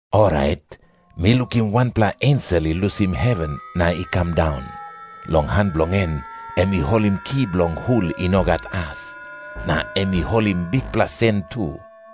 Orait mi lukim wanpela ensel i lusim heven na i kam daun. Long han bilong en em i holim ki bilong hul i no gat as. Na em i holim bikpela sen tu.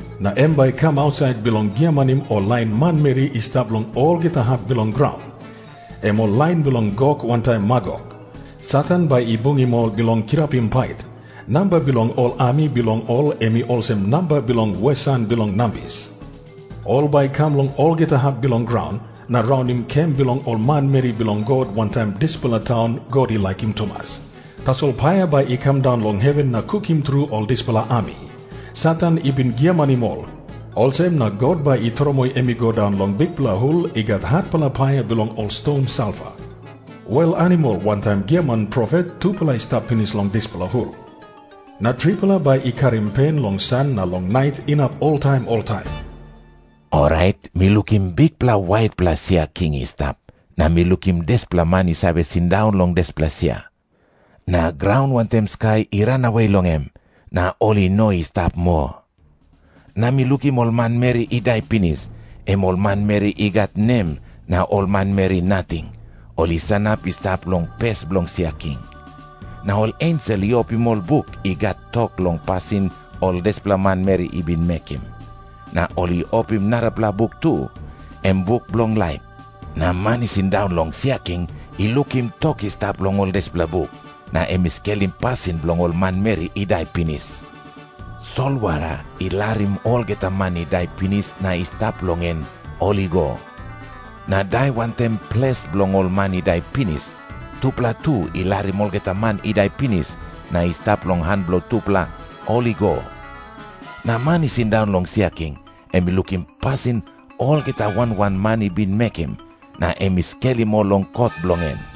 Na em bai i kam ausait bilong giamanim ol lain manmeri i stap long olgeta hap bilong graun, em ol lain bilong Gok wantaim Magok. Satan bai i bungim ol bilong kirapim pait. Namba bilong ol ami bilong ol em i olsem namba bilong wesan bilong nambis. Ol bai i kam long olgeta hap bilong graun, na raunim kem bilong ol manmeri bilong God wantaim dispela taun God i laikim tumas. Tasol paia bai i kam daun long heven na kukim tru ol dispela ami. Satan i bin giamanim ol, olsem na God bai i tromoi em i go daun long bikpela hul i gat hatpela paia bilong ol ston salfa. Wel animal wantaim giaman profet tupela i stap pinis long dispela hul, na tripela bai i karim pen long san na long nait inap oltaim oltaim. Orait mi lukim bikpela waitpela sia king i stap, na mi lukim dispela man i save sindaun long dispela sia. Na graun wantaim skai i ranawe long em, na ol i no i stap moa. Na mi lukim ol manmeri i dai pinis, em ol manmeri i gat nem na ol manmeri nating, ol i sanap i stap long pes bilong sia king. Na ol ensel i opim ol buk i gat tok long pasin ol dispela manmeri i bin mekim. Na ol i opim narapela buk tu, em buk bilong laip. Na man i sindaun long sia king i lukim tok i stap long ol dispela buk, na em i skelim pasin bilong ol manmeri i dai pinis. Solwara i larim olgeta man i dai pinis na i stap long en, ol i go. Na Dai wantaim Ples bilong ol man i dai pinis, tupela tu i larim olgeta man i dai pinis na i stap long han bilong tupela, ol i go. Na man i sindaun long sia king em i lukim pasin olgeta wan wan man i bin mekim, na em i skelim ol long kot bilong en.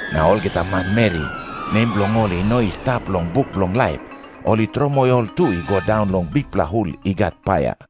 Na olgeta manmeri, nem bilong ol i no i stap long buk bilong laip, ol i tromoi ol tu i go daun long bikpela hul i gat paia.